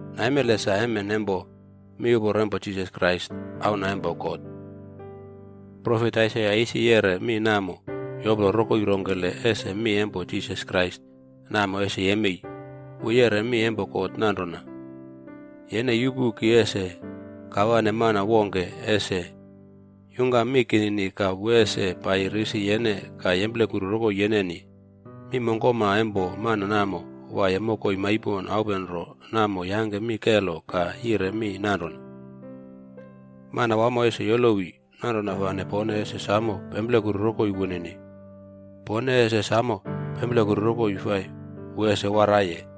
Naimele sa emen empo miuporo empo Jisas Krais Auna empo God. Profet Aisaia isi yeꞌre mi namo yoplo rokoi rongkele ese mi empo Jisas Krais namo ese yemei. Wu yeꞌre mi empo God nanrona, “Yene yupu. Ki ese kawane mana wongke ese yungkam mi kinini ka wu ese paiyi risi yene ka yemplekuru rokoi yeneni. Mi mongkoma empo mana namo waiye mokoi maipon aupenro namo yangke mi kelo ka yire mi nanrona, ‘Manawamo ese yolowi, nanrona fane pone ese samo pemplekuru rokoi wunini. Pone ese samo pemplekuru rokoi fai wu ese waraiye.a’”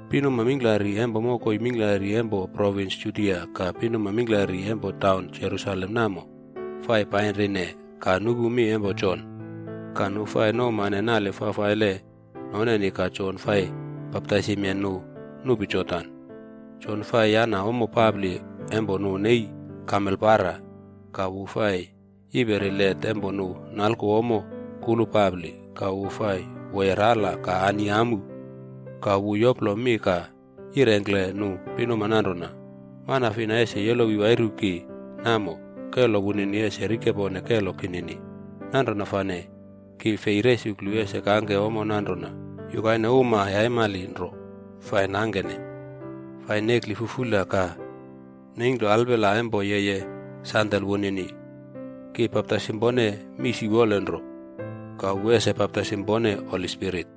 Pinuma mingklari empo mokoi mingklari empo provins Judia ka pinuma mingklari empo taunwamo Jerusalem namo fai painrine ka nupu mi empo Jon. Ka nu fai nouwmane nale fafaile noneni ka Jon fai baptaisimye nu nupi Jordan. Jon fai yana ommo papli empo nu nei kamel para,bc ka wu fai yiperi let empo nu nalku ommo kulu papli. Ka wu fai woye rala ka ani amu. Ka wu yoplo mi ka yirengkle nu pinuma nanrona, “Mana fina ese yolowi wairu ki namo, kelo wunini ese rikepone kelo kinini. Nanrona fane ki fei resuklu ese kangke ommo nanrona yukaine uma yaimali nro fai nangkene, fai nekli fufula ka neingklo alpela empo yeye sandel wunini. Ki baptaisim pone mii siwolenro, ka wu ese baptaisim pone Holi Spirit.”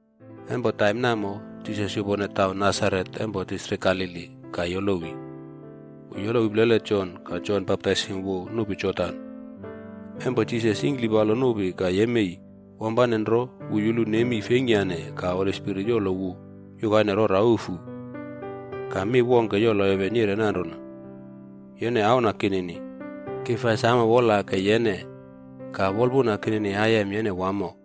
Empo taim namo, Jisas yupone taun Nasaret empo distrik Galili ka yolowi. Wu yolowi plele Jon ka Jon baptaisim wu nupi Jordan. Empo Jisas yingklipalo nupi ka yemei, wampane nro wu yulu nemi feingkyane ka Holi Spirit yolo wu yukaine rora ufu. Ka mi wongke yolo heven yire nanrona, “Yene auna kinini. Ki fai samo wolake yene. Ka wolpuna kinini aiyem yene wamo.”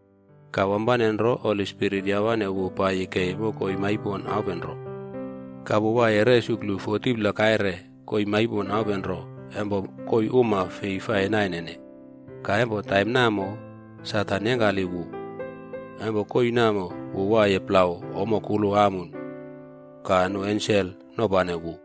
Ka wampane nro Holi Spirit yawane wu paiyi kei mokoi maipon aupenro. Ka wu waiye resuklu 40pla kaire koii maipon aupenro empo koii uma fei fai nainene. Ka empo taim namo, Satan yengkali wu. Empo koii namo wu waiye plau ommo kulu amun. Ka nu ensel nopane wu.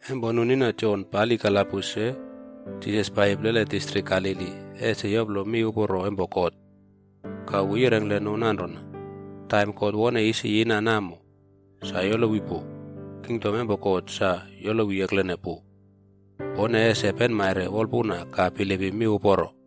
Empo nu nina Jon pali kalabus se, Jisas paiyi plele distrik Galili ese yoplo miuporo empo God. Ka wu yirengkle nu nanrona, “Taim God wone isi yina namo, sa yolowi pu. Kingdom empo God sa yolowi eklene pu. Pone ese penmaire wolpuna ka bilipim miuporo.”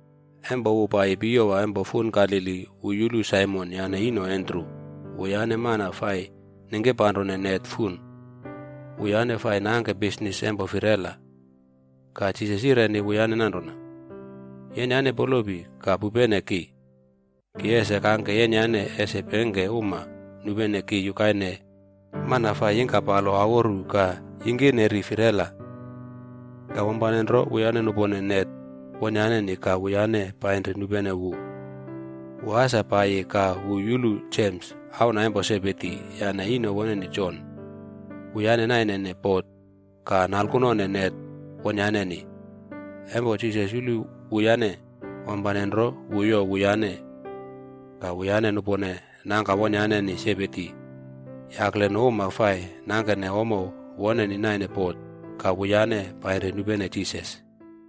Empo wu paiyi piyowa empo fun Galili, wu yulu Saimon yane ino Andru. Wuyane mana fai ningkirpanrone net fun. Wuyane fai nangke bisnis empo firela. Ka Jisas yireni wuyane nanrona, “Yenyane polopi ka pupene ki. Ki ese kangke yenyane ese pengke uma nupene ki yukaine mana fai yingkapalo aworu ka yingkineri firela.” Ka wampane nro, wuyane nupone net wonyaneni ka wuyane painri nupene wu. Wu asa paiyi ka wu yulu Jems, auna empo Sebedi, yane ino woneni Jon. Wuyane nainene bot ka nalkunone net wonyaneni. Empo Jisas yulu wuyane, wampane nro wu youw wuyane. Ka wuyane nupone nangka wonyaneni Sebedi yakle nu uma fai nangkene ommo woneni naine bot ka wuyane painri nupene Jisas.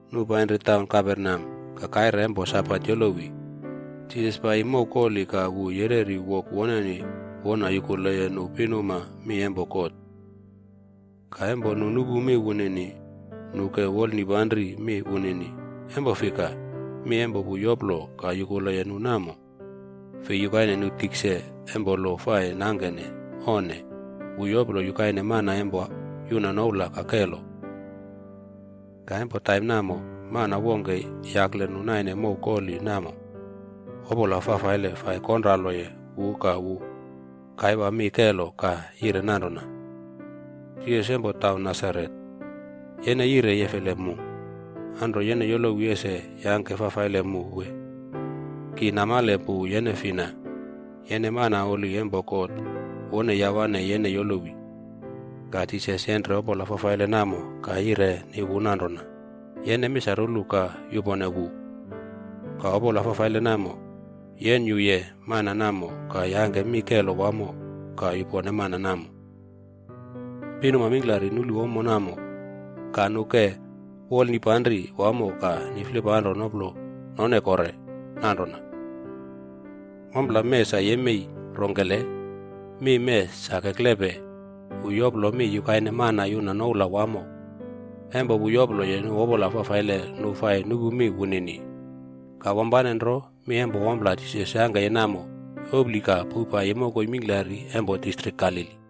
Nu painri taun Kaperneam. Ka kaire empo Sabat yolowi, Jisas paiyi mow koli ka wu yereri wok woneni wona yukule nu pinuma mi empo God. Ka empo nu nupu mi wunini, nu ke wolnipanri mi wunini, empo fika, mi empo wu yoplo ka yukuleye nu namo, fei yukaine nu tikse empo lo fai nangkene, onne. Wu yoplo yukaine mana empo yuna noula ka kelo. Ka empo taim namo, mana wongke yakle nu naine mow koli namo, opola fafaile fai konraloye wu ka wu kaiwa mi kelo ka yire nanrona, Jisas empo taun Nasaret, yene yire yefele mu? Anro yene yolowi ese yangke fafaile mu wee? Ki namale pu yene fina. Yene mana holi empo God wone yawane yene yolowi. Ka Jisas yenre opola fafaile namo ka yireni wu nanrona, “Yene misarulu ka yupone wu.” Ka opola fafaile namo yenyuye mana namo ka yangke mi kelo wamo ka yupone mana namo. Pinuma mingklari nulu ommo namo ka nu ke wolnipanri wamo ka niflipanro noplo none kore nanrona, “Ompla mee sa yemei rongkele? Mi mee sa keklepe, wu yoplo mi yukaine mana yuna noula wamo. Empo wu yoploye nu opola fafaile nu fai nupu mi wunini.” Ka wampane nro mi empo ompla Jisas yangkeye namo, yopli ka powpaiyi mokoi mingklari empo distrik Galili.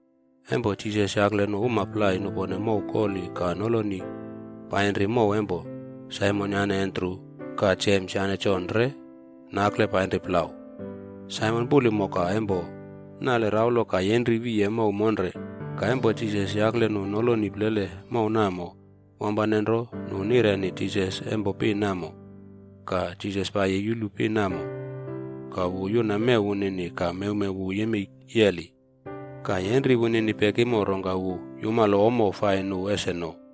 Empo Jisas yakle nu uma plai nupone mow koli ka nolo painri mow empo Saimon yane Andru. Ka Jems yane Jon re nakle painri plau. Saimon puli moka empo nale raulo ka yenri wiye mow monre. Ka empo Jisas yakle nu noloni plele mow namo, wampane nro nu nireni Jisas empo pin namo. Ka Jisas paiyi yulu pin namo, ka wu yuna mew wunini ka mewmew wu yemei yeli. Ka yenri wunini pekimo rongka wu yumalo ommo fai nu ese no.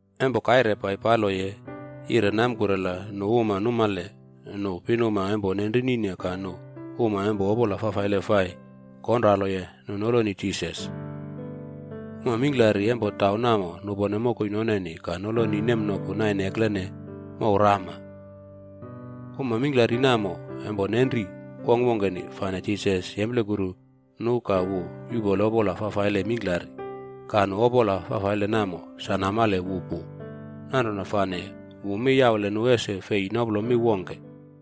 Empo kaire paipaloye yire namkurela nu uma numale nu pinuma empo nenrinine ka nu uma empo opola fafaile fai konraloye nu noloni Jisas. Uma mingklari empo taun namo nupone mokoi noneni ka noloni nemnoku naine eklene mouw rama. Uma mingklari namo empo nenri wongkwongkeni, fane Jisas yemplekuru nu ka wu yuꞌpole opola fafaile mingklari. Ka nu opola fafaile namo sa namale wu pu, nanrona fane wu mi yaule nu ese fei noplo mi wongke.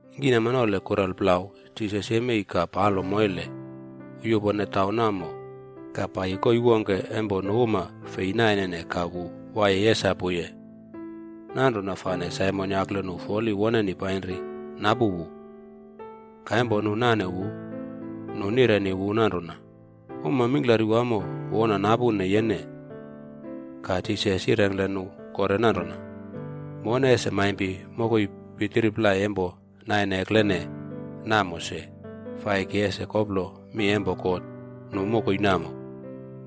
Ningkinamnole kurelplau Jisas yemei ka palo moile. Wu yupone taun namo ka paiyi koii wongke empo nu uma fei nainene ka wu waiye yesapuye. Nanrona fane Saimon yakle nu foli woneni painri napu wu. Ka empo nu nane wu, nu nireni wu nanrona, “Uma mingklari wamo wona napune yene.” Ka Jisas yirengkle nu kore nanrona, “Mone ese maimpi mokoi pitiri plai empo naine eklene namo se, fa ki ese koplo mi empo God nu mokoi namo.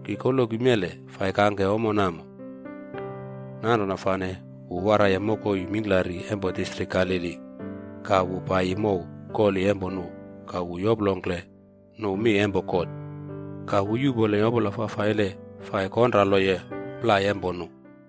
Ki koloki mele fai kangke ommo namo.” Nanrona fane wu waraiye mokoi mingklari empo distrik Galili ka wu paiyi mow koli empo nu ka wu yoplongkle nu mi empo God. Ka wu yuꞌpoleye opola fafaile fai konraloye plai empo nu.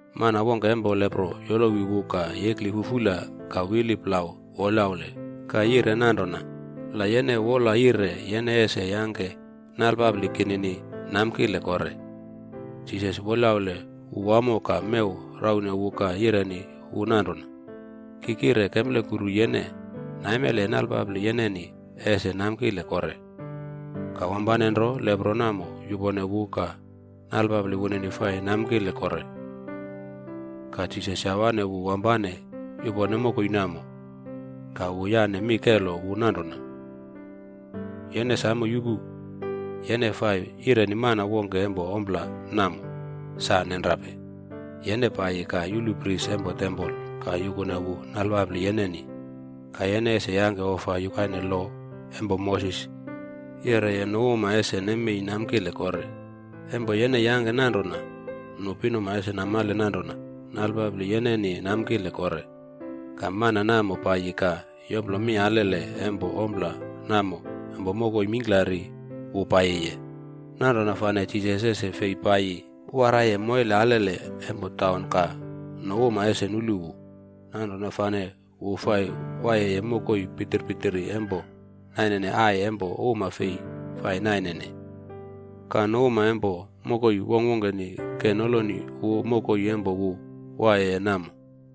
Mana wongke empo lepro yolowi wu ka yekli fufula ka wili plau wolyaule ka yire nanrona, “La yene wola yire, yene ese yangke nalpapli kinini namkile kore.” Jisas wolyaule wu wamo ka mew raune wu ka yireni wu nanrona, “Ki kire kemplekuru yene. Naimele nalpapli yeneni ese namkile kore.” Ka wampane nro lepro namo yupone wu ka nalpapli wunini fai namkile kore. Ka Jisas yawane wu wampane yupone mokoi namo, ka wu yane mi kelo wu nanrona, “Yene samo yupu, yene fai yireni mana wongke empo ompla namo. Sa nenrape! Yene paiyi ka yulu pris empo tempol ka yukune wu nalpapli yeneni. Ka yene ese yangke ofa yukaine lo empo Moses yeꞌreye nu uma ese nemei namkile kore. Empo yene yangke nanrona, nu pinuma ese namale nanrona nalpapli yeneni namkile kore.” Ka, mana namo paiyi ka yoplo mi alele empo ompla namo empo mokoi mingklari wu paiyiye. Nanrona fane Jisas ese fei paiyi waraiye moile alele empo taun ka nu uma ese nulu wu. Nanrona fane wu fai waiyeye mokoi pitir pitiri empo nainene ai empo uma fei fai nainene. Ka, nu uma empo mokoi wongkwongkeni ke noloni wu mokoi empo wu waiyeye namo.